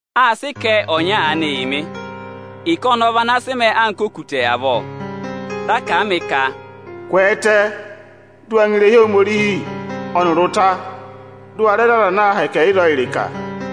Â sị ịkẹ ọnya aanị yị mị. Ịkẹ ọnọọ vị ana sị mẹẹ anka okutẹ avọọ. Dị a kà a mị ka: Ma kwẹẹtẹ, dị ma ngọ irehi Ohomorihi ọnịrị ụta, dị ma rẹ za aza ana aa mẹ ahẹkẹ ịzọọ ịrịka nị.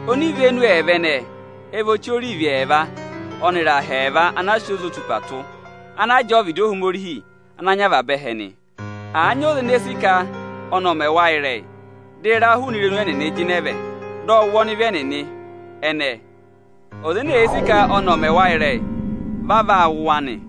Onivenu ẹẹva ẹnẹẹ ẹ vị ọchị orivi ẹẹva ọnịrị aha ẹẹva ana aā sị ozotupaa tụ́, ana jẹẹ ọvịdị Ohomorihi ana nyị avaba ẹhẹ nị. Àa nyị ọza ene sì ka ọnị ọ̀ mẹ ịrẹyị, dị ịra jịnẹ hụụnị irenu ẹnịnị vẹ, dị ọ wụ ọnịvị ẹnịnị ẹnẹẹ. Aza ene èe sì ka ẹnị ẹ̀ mẹ wa ịrẹyị, vị a vaa wụ̀ wa nị.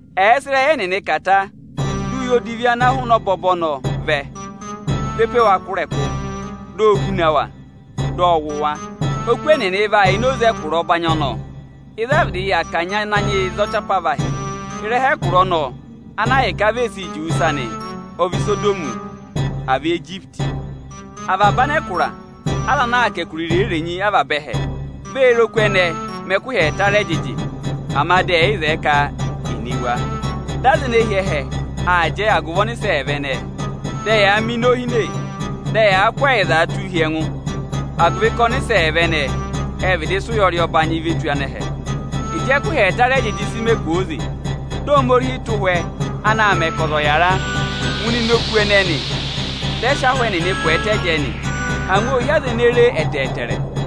Ẹ̀ẹ sị ịrẹyị ẹnịnị kà ta, dị uye odivi ana jịnẹ hụụnị ọbọbọ ọnọọ vẹ, ve pe wa kụ̀ ịrẹkụ. O vee huna wa, dị ọ wụ̀ wa. Oku ẹnịnị vaa yà ini oze ẹkụra ọbanyị, ịzị a vịdị kanyị Ananyị yị za ọchị apavahị. Ịrẹha ẹkụra ọnọọ ana ahịka vị e si juwe ịsa nị, aā hị́ Isodọmị, à vị Ijipiti nị. Avaba anẹkụra, aza ana aa kà ẹkụra irenyi-irenyi avaba ẹhẹ, vee re oku ẹnẹẹ mẹ ẹkụhị ẹẹta rị ẹjịjị, ama dị ẹ́ yị zẹẹ ka è ne wa. Dị anẹhẹ nịnị aa jẹ agụvị ọnịsẹ ẹẹva ẹnẹẹ. Dị ẹyaa mẹ inohine, dị ẹyaa kụ́ ẹyịza tụ́ụ hi ẹngụ, agụvị ka ọnịsẹ ẹẹva ệ vịdị sị ụyọrị va tù anẹhẹ. Ịjị ẹkụhị ẹẹta rị ẹjịjị sị mẹ kwooze, dị Ohomorihi tụ́ ụhwẹ ana aa mẹ ka ọza ọ̀ yàra, ngụ ịnịnẹ oku ẹnẹẹ nị. Dị ẹ sị ahụ ẹnịnị kwẹẹtẹ jẹẹ nị. Angwa ô hi aza ene re e ẹtẹẹtẹrẹ.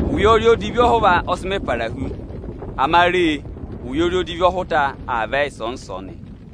Ụyọrị odivi ọhụva ọ sị mẹ para hu; ama re, ụyọrị odivi ọhụta aa vẹ ịsọọnị-ịsọọnị.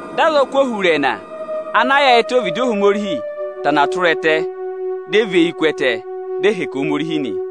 Dị azọkụ ohurẹẹna ana yaayịtẹ ọvịdị Ohomorihi tana tụra ẹtẹ, dị ẹ và eyi ku ẹtẹ, dị ẹ hẹkẹ Ohomorihi nị.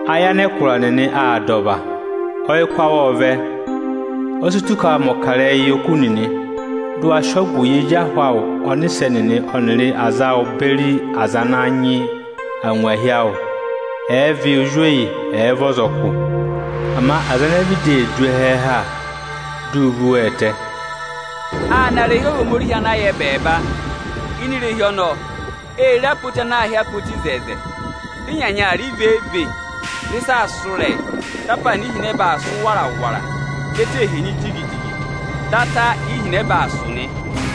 Ayị anẹkụra nịnị aa dà ọva, ọyịkụ awụ ộ vẹ. O si tù ka à mẹ̀ ọkarẹyị yị oku nịnị, dị ụ wa sị ọgụ yị ezi ahụ awụ ọnịsẹ nịnị ọnịrị aza awụ beri aza ana nyị angwahi awụ, ẹ̀ẹ vị ozweyi, ẹ̀ẹ vị ọzọkụ. Ama aza ene vịdị ee du ẹhẹẹ ha, di u vu wa ẹtẹ. Â na irehi Ohomorihi ana yà ẹbẹẹba. Ini irehi ọnọọ, ê re apoti ana aā hị́ apoti oto. Dị ịnyanya aa rị vee-vee, dị ịsa aa sụ́ ịrẹyị, dị apaana ihinẹba aa sụ́ wara-wara nị. Ẹtẹ ee henyi jigi-jigi, dị ata ihinẹba aa sụ̀ nị.